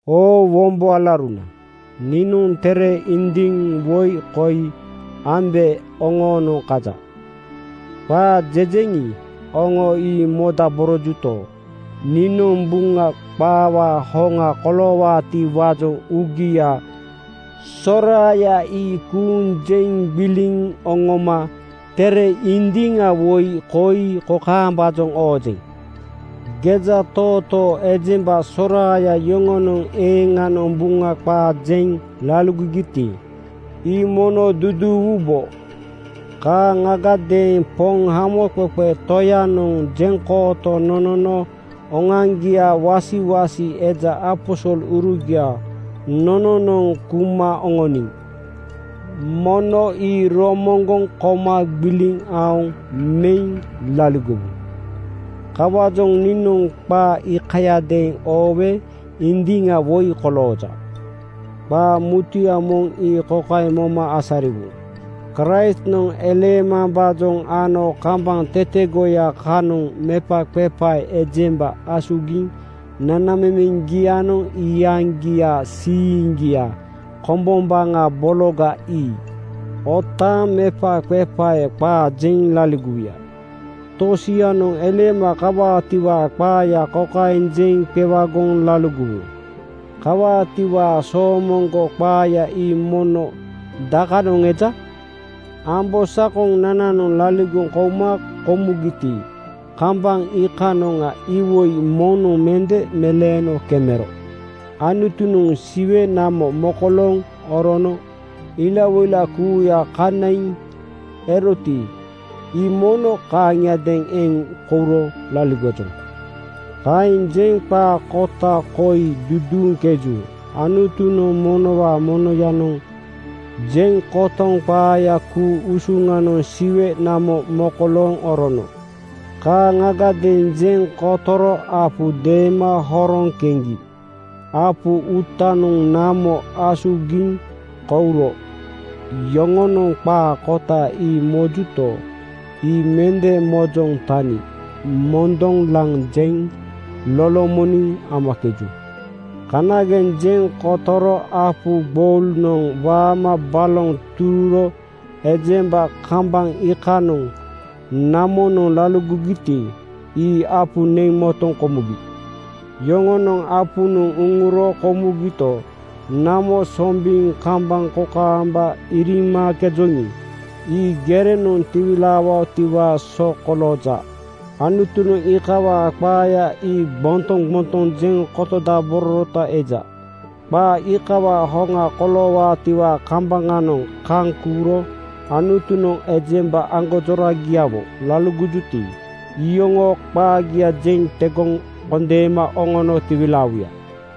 Oo wombo alauruna, niinoŋ tere indiŋ woi koi ambe oŋoonoŋ kaja. Qaa jejeŋi, oŋo ii modaborojuto, niinoŋ Buŋa qaawaa hoŋa koloowaatiwaajoŋ uugia soraaya ii kuuŋ jeŋ gbiliŋ oŋoma tere indiŋa woi koi kokaembaajoŋ oojeŋ: Gejatootoo ejemba soraaya yoŋonoŋ eeŋanoŋ Buŋa qaa jeŋ laligogiti, ii mono duduuwubo. Kaaŋagadeeŋ Poŋ Hamoqeqe Toyanoŋ jeŋkooto nonono oŋoaŋgiaa wasiwasi eja aposolurugia nononoŋ kuma oŋoniŋi, mono ii romoŋgoŋ koma gbiliŋ aoŋ meŋ laligowu. Kawaajoŋ niinoŋ qaa iikayadeeŋ oowe indiŋa woi kolooja. Qaa mutuya moŋ ii kokaeŋ moma asariwu: Kraistnoŋ eleemambaajoŋ ano kambaŋ tetegoya kanoŋ mepaqepae ejemba asugiŋ nanamemeŋgianoŋ iyaŋgiaa siiŋgia kombombaŋa bologa ii otaaŋ mepaqepae qaa jeŋ laligowuya. Tosianoŋ eleema kawaatiwaa qaaya kokaeŋ jeŋ qewagoŋ laligowu: “Kawaatiwaa soomoŋgo qaaya ii mono dakanoŋ eja? Ambosakonananoŋ laligoŋ kouma komugiti, kambaŋ iikanoŋa iwoi moŋnoŋ mende meleeno kemero. Anutunoŋ Siwe namo mokolooŋ orono ilawoila kuuya kanaiŋ eroti, ii mono kaaŋiadeeŋ eŋ kouro laligojoŋ.” Kaeŋ jeŋ qaa kota koi duduuŋkeju: Anutunoŋ monowaa monoyanoŋ jeŋ kotoŋ qaayaa ku-usuŋanoŋ siwe namo mokolooŋ orono. Kaaŋagadeeŋ jeŋ kotoro apu deema horoŋ keŋgi apu uutanoŋa namo asugiŋ kouro. Yoŋonoŋ qaa kota ii mojuto, ii mende mojoŋ tani mondoŋ laŋ jeŋ lolomoniŋ amakeju. Kanageŋ jeŋ kotoro apu gboulunoŋ waama baloŋ tururo ejemba kambaŋ iikanoŋ namonoŋ laligogiti, ii apu neŋ motoŋ komugi. Yoŋonoŋ apunoŋ uŋuro komugito, namo sombiŋ kambaŋ kokaamba iriimakejoŋi, ii gerenoŋ tiwilaawaatiwaa so kolooja. Anutunoŋ iikawaa qaaya ii gbontoŋ gbontoŋ jeŋ kotodabororota eja. Qaa iikawaa hoŋa koloowaatiwaa kambaŋanoŋ kaŋ kuuro Anutunoŋ ejemba aŋgonjoragiawo laligowuti, iyoŋoo qaagia jeŋ tegoŋ kondeema oŋono tiwilaawuya.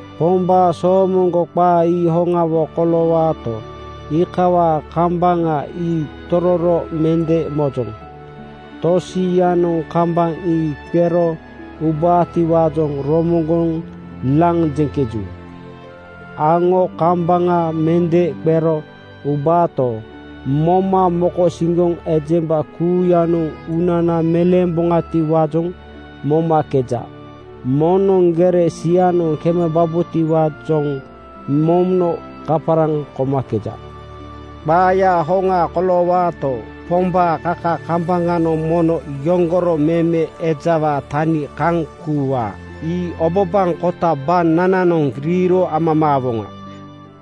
Pombaa soomoŋgo qaa ii hoŋawo koloowaato, iikawaa kambaŋa ii tororo mende mojoŋ. Tosianoŋ kambaŋ ii qero ubaatiwaajoŋ romoŋgoŋ laŋ jeŋkeju. Aŋo kambaŋa mende qero ubaato, moma mokosiŋgoŋ ejemba kuuyanoŋ uunana meleemboŋatiwaajoŋ mambomakeja. Moŋnoŋ gere sianoŋ kemebabotiwaajoŋ mono kaparaŋ komakeja. Qaayaa hoŋa koloowaato, Pombaa kaka kambaŋanoŋ mono yoŋgoro meme ejawaa tani kaŋ kuuwaa. Ii obabaŋ kota banananoŋ riiro amamaawoŋa.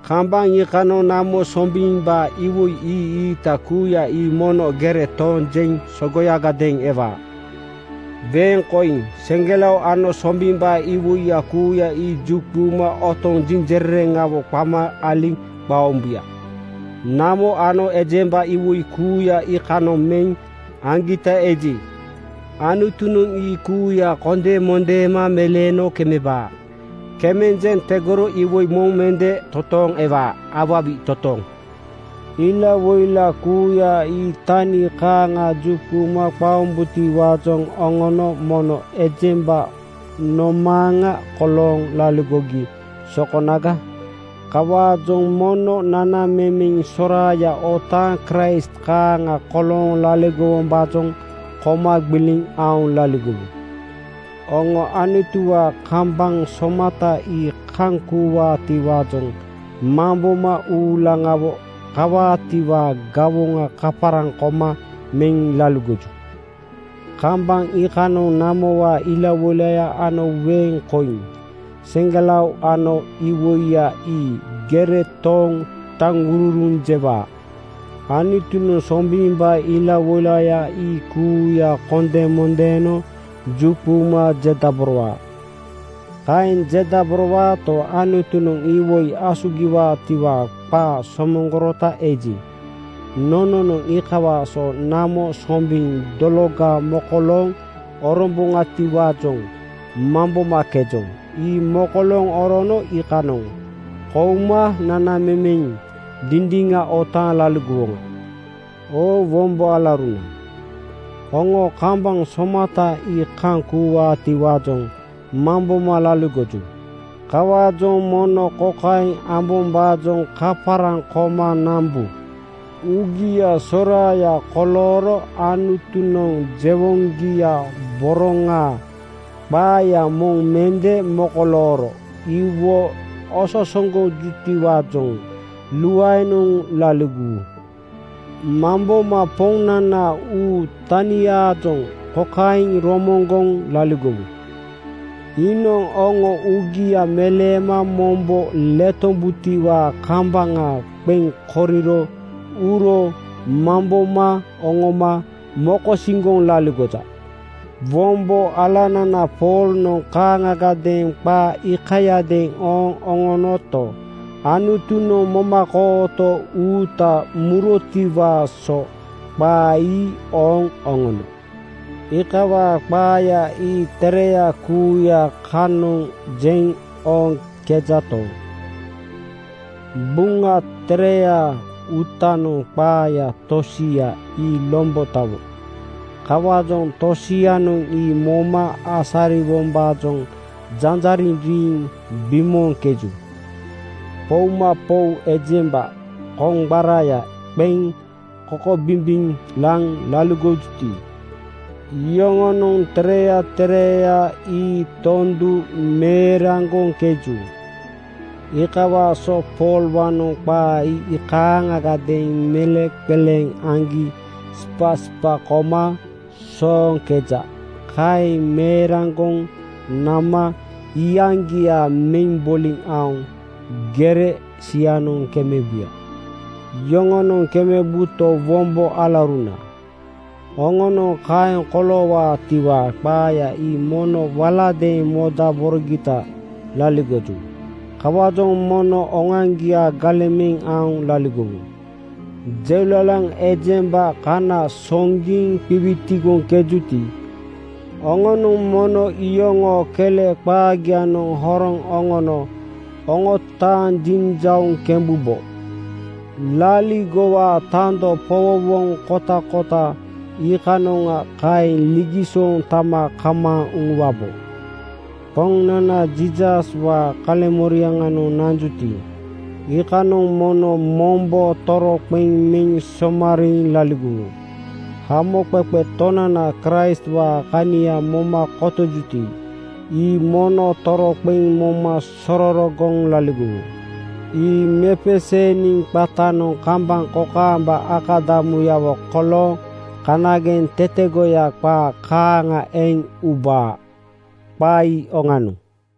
Kambaŋ iikanoŋ namo sombimbaa iwoi ii-iita kuuya ii mono gere tooŋ jeŋ sogoyagadeeŋ ewaa. Weeŋ koiŋ, seŋgelao ano sombimbaa iwoiya kuuya ii juquma otoŋ jinjerereŋawo qama aliŋ qaombuya. Namo ano ejembanoŋ iwoi kuuya iikanoŋ meŋ aŋgita eji, Anutunoŋ ii kuuya kondemondeema meleeno kemebaa. Kemeŋ jeŋ tegoro iwoi moŋ mende totooŋ ewaa. Awawi totooŋ! Ilawoila kuuya ii tani kaaŋa juquma qaombutiwaajoŋ oŋonoŋ mono ejemba nomaaŋa kolooŋ laligogi sokonaga? Kawaajoŋ mono nanamemeŋ soraaya otaaŋ Kraist kaaŋa kolooŋ laligowombaajoŋ koma gbiliŋ aoŋ laligowu. Oŋo Anutuwaa kambaŋ somata ii kaŋ kuuwaatiwaajoŋ mamboma uulaŋawo kawaatiwaa gawoŋa kaparaŋ koma meŋ laligoju. Kambaŋ iikanoŋ namowaa ilawoilaya ano weeŋ koiŋ, seŋgelao ano iwoiya ii gere tooŋ taŋururuŋ jewaa. Anutunoŋ sombimbaa ilawoilaya ii kuuya kondemondeeno juquma jedaborowaa. Kaeŋ jedaborowaato, Anutunoŋ iwoi asugiwaatiwaa qaa somoŋgorota eji, nononoŋ iikawaa so namo sombiŋ dologa mokolooŋ orombaatiwaajoŋ mambomakejoŋ. Ii mokolooŋ orono iikanoŋ keuma nanamemeŋ dindiŋa otaaŋ laligowoŋa. Oo wombo alauruna, oŋo kambaŋ somata ii kaŋ kuuwaatiwaajoŋ mamboma laligoju. Kawaajoŋ mono kokaeŋ ambombaajoŋ kaparaŋ koma nambu: Uugia soraaya kolooro Anutunoŋ jewoŋgia boroŋaa qaaya moŋ mende mokolooro iwo ososogojutiwaajoŋ luaenoŋ laligowu. Mamboma Poŋnanaa uu taniaajoŋ kokaeŋ romoŋgoŋ laligowu: Iinoŋ oŋo uugia meleema mombo letombutiwaa kambaŋa qeŋ koriro uro mamboma oŋoma mokosiŋgoŋ laligoja. Wombo alanana Poolnoŋ kaaŋagadeeŋ qaa iikayadeeŋ ooŋ oŋonoto, Anutunoŋ momakooto uuta murotiwaa so qaa ii ooŋ oŋono. Iikawaa qaaya ii tereya kuuya kanoŋ jeŋ ooŋkejato, Buŋa Tereyaa uutanoŋ qaaya tosia ii lombotawo. Kawaajoŋ tosianoŋ ii moma asariwombaajoŋ janjariŋ riiŋ bimooŋkeju. Poumapou ejemba koŋgbara qeŋ kokobimbiŋ laŋ laligoŋkejuti, iyoŋonoŋ tereya tereya ii tondu meeraŋgoŋkeju. Iikawaa so Poolwaanoŋ qaa ii kaaŋagadeeŋ meleŋqeleeŋ aŋgi sipasipa koma sooŋkeja. Kaeŋ meeraŋgoŋ nama iyaŋgia meŋ boliŋ aoŋ gere sianoŋ kemebuya. Yoŋonoŋ kemebuto, wombo alauruna, oŋonoŋ kaeŋ koloowaatiwaa qaaya ii mono waladeeŋ modaborogita laligoju. Kawaajoŋ mono oŋoaŋgia galeŋ meŋ aoŋ laligowu. Jeulalaŋ ejemba kana soŋgiŋ qiwitigoŋkejuti, oŋonoŋ mono iyoŋoo kele qaagianoŋ horoŋ oŋono oŋotaaŋ jiŋjauŋ kembubo. Laaligowaa tando powowoŋ kotakota iikanoŋa kaeŋ ligisooŋ tama kamaaŋ uŋuwabo. Poŋnana Jiisaswaa kaleŋmoriaŋanoŋ nanjuti, iikanoŋ mono mombo toroqeŋ meŋ somariiŋ laligowu. Hamoqeqe Tonana Kraistwaa kania moma kotojuti, ii mono toroqeŋ moma sororogoŋ laligowu. Ii mepeseeniŋ qatanoŋ kambaŋ kokaamba akadamuyawo kolooŋ kanageŋ tetegoya qaa kaaŋa eŋ ubaa. Qaa ii oŋanoŋ.